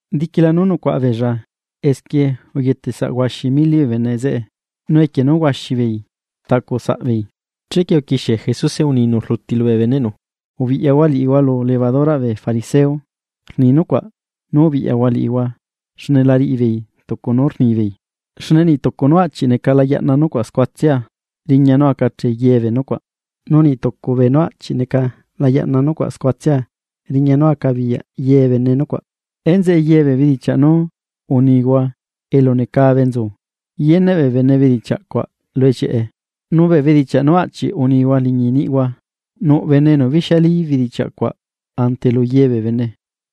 Diquila nú nucuaꞌa beella esquie uyetesaꞌ huaxi mili bee bene zeꞌe, nu equie nú huaxi beei rtaꞌcu saꞌbeei. Chequie uquixie Jesuse uninu rluti lubee beneꞌnu: ―Ubiꞌyahua liꞌihua lu levaduraꞌ bee fariseo, rni nucuaꞌ nú ubiꞌyahua liꞌihua xne la riꞌi beei tucu nú rnibeei. Xne niꞌ tucu nú aꞌchi neca la yaꞌna nucuaꞌ scuatsia, riña nú acachee ye bee nucuaꞌ, nu niꞌ tucu beenú aꞌchi neca la yaꞌna nucuaꞌ scuatsia, riña nú acabiyaꞌ ye bene nucuaꞌ. Enzeꞌe ye bee bedichiaꞌ nú unihua elu necabe nzu, yeneꞌ bee bene bee bedichiaꞌ cuaꞌ lu ellieꞌe, nu bee bedichiaꞌ nú aꞌchiꞌ unihua liñi niꞌihua, nuꞌ bene enu bixialí bedichiaꞌ cuaꞌ ante lu ye bee bene.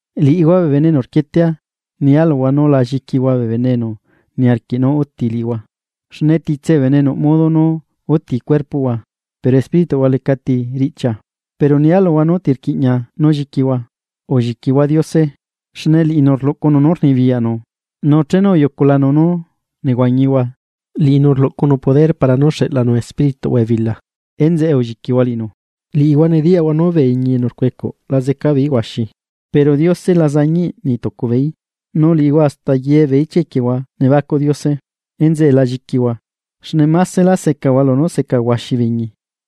’Liꞌihua bee bene enu rquietea, nia luhua nú la lliquihua bee bene enu niarquiꞌ nú uti liꞌihua. Xne titse bee bene nuꞌ modo nú uti cuerpoꞌhua, pero espírituꞌhua lecati riꞌchia Pero nia luhua nú ti rquiꞌña nú lliquihua: Ulliquihua Diose, xne liꞌinu rluꞌcunu nú rnibiyaꞌnu nu chenu uyuculanu nú nehuañihua, liꞌinu recanu xeꞌlanu espírituꞌhua ebila. Enzeꞌe ulliquihua liꞌinu. ’Liꞌihua nediyaꞌhua nú bee iñi enu rcuecuꞌ la zeca beeí huaxi, pero Diose la zañiꞌ niꞌ tucu beeí. Nu liꞌihua hasta ye bee ichia equiehua nebacuꞌ Diose. Enzeꞌe la lliquihua, xne másela secahua lunú seca huaxi bee iñi.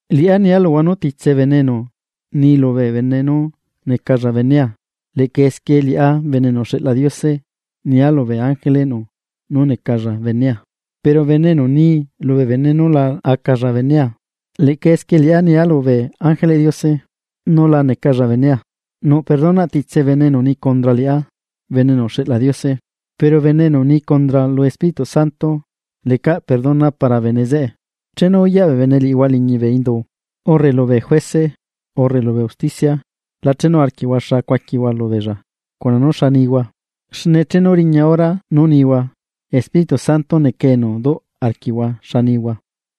’Liꞌá nia luhua nú titse bene enu ni lubee bene nú necalla benea, leꞌca esquie liꞌá Bene enu uxeꞌla Diose nia lubee ángeleꞌnu nú necalla benea. Pero bene enu ni lubee bene nú la acalla benea, leꞌca esquie liꞌá nia lubee ángeleꞌ Diose nú la necalla benea. ’Nuꞌ perdonaꞌ titse bene enu ni condra liꞌá Bene enu uxeꞌla Diose, pero bene enu ni condra lu Espíritu Santo. Lecaꞌ perdona para bene zeꞌe. ’Chenu uyaꞌ bee bene liꞌihua liñi bee indu, urre lubee juece, urre lubee usticia, la chenu arquiꞌhua xa cuaquihua lubeella cuna nú xa nihua. Xne chenu riña hora nú nihua, Espíritu Santo neca enu duꞌ arquiꞌhua xanihua.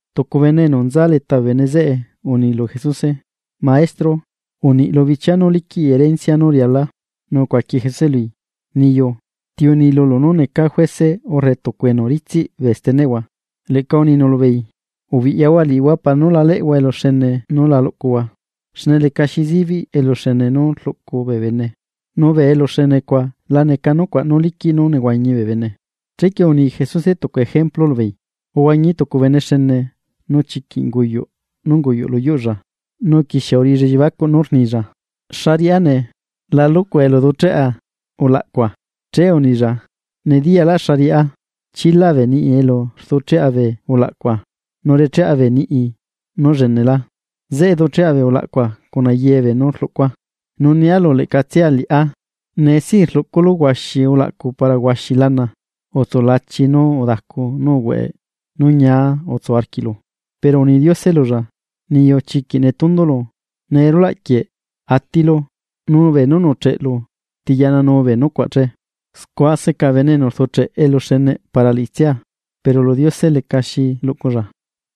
Tucu bene enu nza leta bee bene zeꞌe uni lu Jesuse: ―Maestro, uniꞌ lu bichiaa nú liquiꞌi rencia nú rialaa. Nu ucuaqui Jesuse lui: ―Niyu, ¿ti uni lulu nú neca juece urre tucu enu ritsiꞌ bee steneꞌhua? Leꞌca uninu lubeei: ―Ubiꞌyahua liꞌihua para nú la leꞌhua eluxene nú la luꞌcuhua, xne lecaxi zibiꞌ eluxene nú rluꞌcu bee bene, nu bee eluxene cuaꞌ la neca nucuaꞌ nú liquiꞌ nú nehuañi bee bene. Chequie uni Jesuse tucu ejemplu lubeei: ―Uhuañi tucu bene xene, nu chiquiꞌ unguyuꞌ nú unguyuꞌ lu yuꞌlla. Nu uquixie uriꞌilla elliebacuꞌ nú rnilla: “¿Xa riꞌá nee? La lucua elu ducheꞌa ulaꞌcua.” Che unilla: “Nediyalá xa riꞌá, chila bee niꞌi elu rducheꞌa bee ulaꞌcua, nu recheꞌa bee niꞌi nú llenelá. Zeꞌe ducheꞌa bee ulaꞌcua cuna ye beenú rluꞌcua. Nu nia lu leꞌcatsia liꞌá: Nee sí rluꞌculu huaxi ulaꞌcu para huaxi lana, utsulachi nu udacu nu uhueꞌ nu ñia utsu arquiꞌlu.” Pero uni Diose lulla: “Niyu chiquiꞌ netundulu, nee rulaꞌ quieꞌ atilu, nu beenú nuꞌcheꞌelu, ¿ti yaꞌnanuu bee nucuaꞌ che?” Scua seca bene enu rducheꞌ eluxeneꞌ para liꞌitsia, pero lu Diose lecaxi luꞌculla.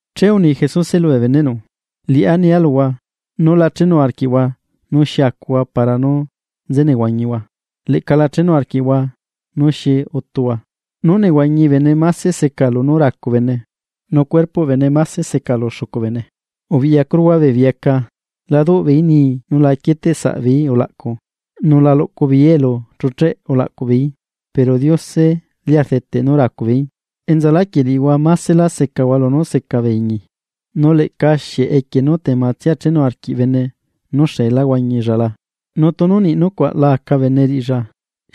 Che uni Jesuse lubee beneꞌnu: ―Liꞌá nia luhua, nú la chenu arquiꞌhua nú xi acuhua para nú nze nehuañihua, leꞌca la chenu arquiꞌhua nú xi utuhua. Nú nehuañi bene máse seca lunú racu bene, nu cuerpoꞌ bene máse seca lu xucu bene. Ubiꞌyacuruhua bee bieca. La duꞌ beeí nii nu la quieteꞌ saꞌbeeí ulaꞌcu, nu la luꞌcu beeí elu chucheꞌ ulaꞌcuꞌ beeí, pero Diose lia rdeteꞌ nú racu beeí. Enzaláquieꞌ liꞌihua másela secahua lunú seca bee iñi. Nu leꞌca, ¿xieꞌ equie nú tematsia chenu arquiꞌ bene nú xeelá huañilla la? Nu tunu niꞌ nucuaꞌ la aca bene riꞌilla,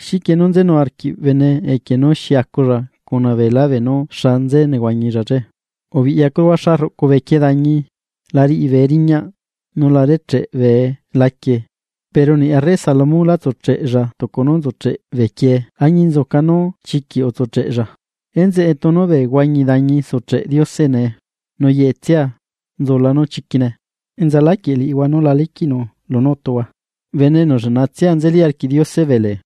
¿xiquie nú nzenu arquiꞌ bene equie nú xi aculla cuna beelá beenú xa nze nehuañilla che? ’Ubiꞌyacuruhua xa rruꞌcu bee quie dañi, la riꞌi bee riñaꞌ, nu la recheꞌ bee laquie. Pero niꞌ arre Salomón lá tsucheꞌlla tucu nú nzucheꞌ bee quie añinzuca nú chiquiꞌ utsucheꞌella. Enzeꞌe, tunu bee huañi dañi sucheꞌ Diose nee, nu yeꞌe tsia nzula nu chiquine, ¡enza láquieꞌ liꞌihua nú la liquiꞌnu lunú utuhua, bene enu lleꞌna tsia nzeli arquiꞌ Diose bee lee!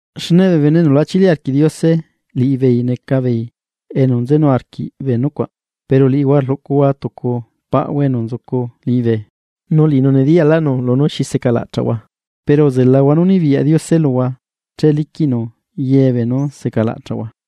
Xne bee bene enu la chili arquiꞌ Diose, liꞌibeei neca beei enu nzenu arquiꞌ bee nucuaꞌ. Pero liꞌihua rluꞌcuhua tucu paꞌhua enu nzucu liñibe, nu liꞌinu nediyaꞌlaꞌnu lunú secalaꞌchaꞌhua. Pero uzelahua nú nibiyaꞌ Diose luhua che liquiꞌnu ye beenú secalaꞌchaꞌhua.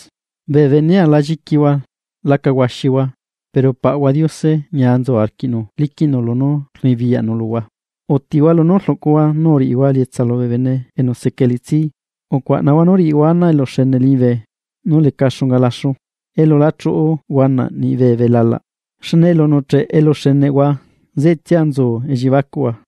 ’Bee benea, la lliquihua laca huaxihua, pero Paꞌahua Diose ñia nzu arquiꞌnu liquiꞌnu lunú rnibiyaꞌnu luhua. Utihua lunú rluꞌcuhua, nu uriꞌihua elietsa lubee bene enu seca elitsi. Ucuaꞌnahua nú riꞌihua ana eluxene liñibe nú leca xunga laxu, elu la chuꞌu huanaꞌ niꞌ bee belalaꞌ. Xne elu nuꞌcheꞌe eluxeneꞌhua zeꞌetsia nzu elliebacuꞌhua.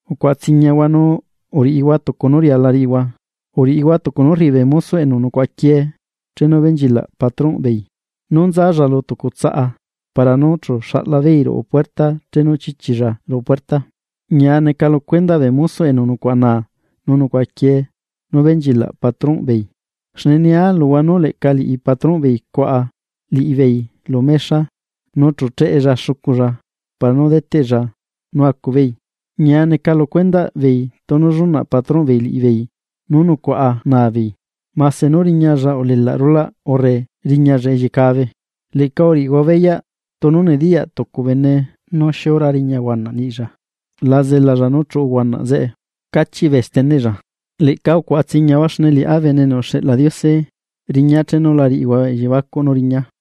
’Ucuaꞌa tsiñahua, nu uriꞌihua tucu nú riala riꞌihua. Uriꞌihua tucu nú rriꞌi bee mosoꞌ enu nucuaꞌaquiee chenu benchilaꞌ patronꞌbeei, nú nzalla lu tucu tsaꞌa para nú chu xaꞌla beei ruꞌu puerta chenu chichilla ruꞌu puerta. Ñia neca lu cuendaꞌ bee mosoꞌ enu nucuaꞌa naa nu nucuaꞌa quiee nú benchilaꞌ patronꞌ beei. Xne nia luhua nú leꞌca liꞌi patronꞌ beei cuaꞌa liꞌibeei lu mexa nu chu cheꞌella xuculla para nú deteꞌlla nú acu beei. Ñia neca lu cuendaꞌ beei tunu llunaꞌ patronꞌ beei liꞌibeei nú nucuaꞌa naa beei, mase nú riñalla ulelaꞌ rulaꞌ urre riñalla elliecabe. Leꞌca uriꞌihua beyaꞌ, tunu nediyaꞌ tucu bene nú xiura riña huanaꞌ niꞌilla, la zelalla nú chuꞌu huanaꞌ zeꞌe cachiꞌ bee steneꞌlla. Leꞌca ucuaꞌa tsiñahua xne liꞌá Bene enu uxeꞌla Diose, riñaa chenu la riꞌihua elliebacuꞌ nú riñaa.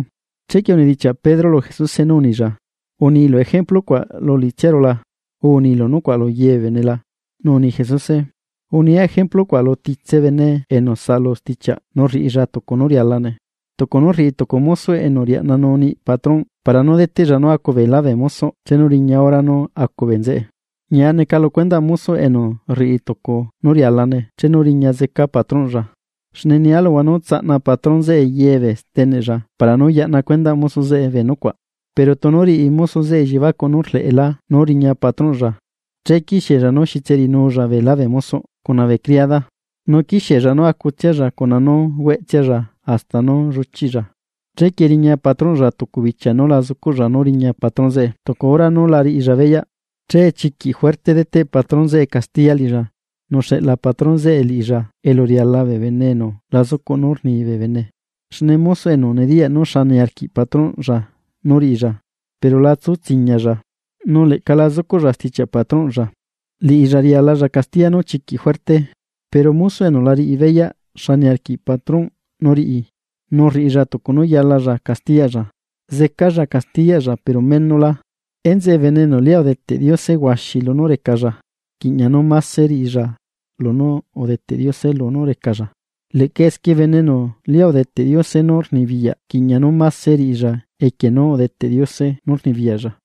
Chequie unidichiaꞌ Pedro lu Jesuse nú unilla: ―¿Unilu ejemplu cuaꞌ lu liꞌitsiaru la? u ¿Unilu nucuaꞌ lu ye bee bene la? Nu uni Jesuse: ―Unia ejemplu cuaꞌ lu titse bene enu saꞌalu stichiaꞌ nu rriꞌilla tucu nú rialane. Tucu nú rriꞌi tucu mosoꞌ enu riaꞌnanuu niꞌi patronꞌ para nú deteꞌlla nú acu beelá bee mosoꞌ chenu riña hora nú acu bee nzeꞌe. Ñia neca lu cuendaꞌ mosoꞌ enu rriꞌi tucu nú rialane chenu riña zeca patronꞌlla. Xne nia luhua nú tsaꞌna patrón zeꞌe ye bee steneꞌlla para nú yaꞌna cuendaꞌ mosoꞌ zeꞌe bee nucuaꞌ. Pero tunu riꞌi mosoꞌ zeꞌe elliebacuꞌ nú rleꞌlá nú riña patrónꞌlla, che quixiella nú xitserinulla beelá bee mosoꞌ cuna bee criada. Nu quixiella nú acutsialla cuna nú hueꞌtsialla hasta nú lluchiꞌlla, chequie riña patrónꞌlla tucu bichia nú la zucuꞌlla, nú riña patron zeꞌe tucu hora nú la riꞌlla beyaꞌ. Che chiquiꞌ juerte deteꞌ patrón zeꞌe castiya liꞌilla, nu xeꞌla patron zeꞌe liꞌilla elu riala bee bene enu la zucuꞌ nú rni bee bene. ’Xne mosoꞌ enu nediyaꞌ nú xa niarquiꞌ patrónꞌlla nú riꞌilla pero la tsu tsiñalla, nu leꞌca la zucuꞌlla stichiaꞌ patrónꞌlla, liꞌilla rialalla castiya nú chiquiꞌ juerte. Pero mosoꞌ enu la riꞌi beyaꞌ xa niarquiꞌ patrónꞌ nú riꞌi, nu rriꞌilla tucu nú yalalla castiyaꞌlla, zecalla castiyaꞌlla pero menola. Enzeꞌe bene enu lia udeteꞌ Diose huaxi lunú recalla, rquiꞌña nú máse riꞌilla lunú udeteꞌ Diose lunú recalla. Leꞌca esquie bene enu lia udeteꞌ Diose nú rnibiyaꞌ rquiꞌña nú máse riꞌilla equie nú udeteꞌ Diose nu rnibiyaꞌlla.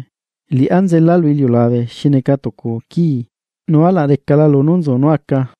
’Liꞌá nzela lu iliulabe xi neca tucu quii, nu alaꞌ recala lunú nzu nú aca.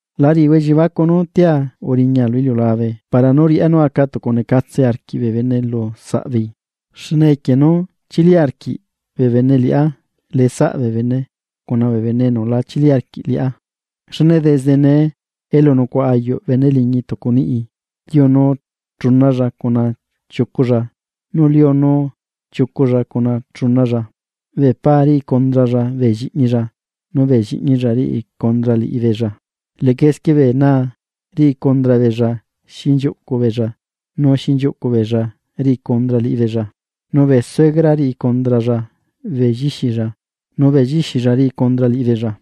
La riꞌihua elliebacuꞌ nú tia uriña lu iliulabe para nú riꞌá nú aca tucunecatse arquiꞌ bee bene lu saꞌ beei. Xne equie nú chili arquiꞌ bee bene liꞌá leꞌe saꞌ bee bene cuna bee bene enu la chili arquiꞌ liꞌá. Xne desde nee elu nucuaꞌa ayuꞌ bene liñi tucu niꞌi, liunu chunalla cuna chiuculla, nu liunu chiuculla cuna chunalla. Bee paa riꞌi condralla bee lliꞌñilla, nu bee lliꞌñilla riꞌi condra liꞌibeella. Leꞌca esquie bee naa riꞌi condra beella xinchiuꞌcu beella nu xinchiuꞌcu beella riꞌi condra liꞌibeella, nu bee suegra riꞌi condralla bee llixilla, nu bee llixilla riꞌi condra liꞌibeella.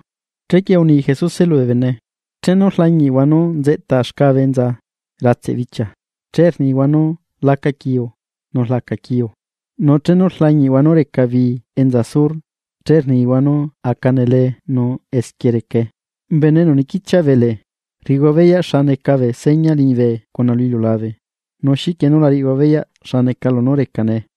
Chequie uni Jesuse lubee bene: ―Chenu rlañiꞌhua nú rliñi xcabe enza ratseꞌ bichia, che rnihua nú laca quiu nu rlaca quiu. Nu chenu rlañihua nú xiuꞌu bii enza sur, che rnihua nú aca nelee nu esquie recae. Bene enu niquichiaꞌ bee lee. Rriꞌihua beyaꞌ xa neca bee seña liñibe cuna lu iliulabe, nu ¿xiquie nú la riꞌihua beyaꞌ xa neca lunú reca nee?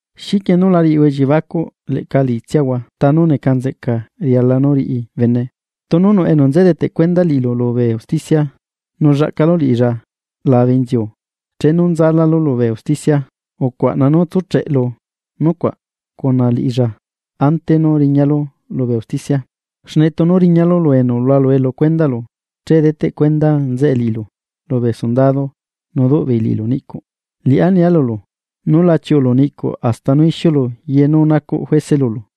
’¿Xiquie nú la riꞌihua elliebacuꞌ leꞌca liꞌitsiahua ta nú neca nzeꞌca riala nú riꞌi bene? Tunu nuꞌ enu nze deteꞌ cuenda liꞌilu lubee usticia, nu llaꞌcalu liꞌilla labe inziu chenu nzalálu lubee usticia ucuaꞌna nú tsúcheꞌlu nucuaꞌ cuna liꞌilla ante nú riñalu lubee usticia. Xne tunu riñalu lu enu hualue lu cuendaꞌlu, che deteꞌ cuenda nzeꞌe liꞌilu lubee sundado nu duꞌ beei liꞌilu niꞌcuꞌ. Liꞌá nia lulu, nú la chiuꞌulu niꞌcuꞌ hasta nú ixiulu ye nú nacuꞌ juece lulu.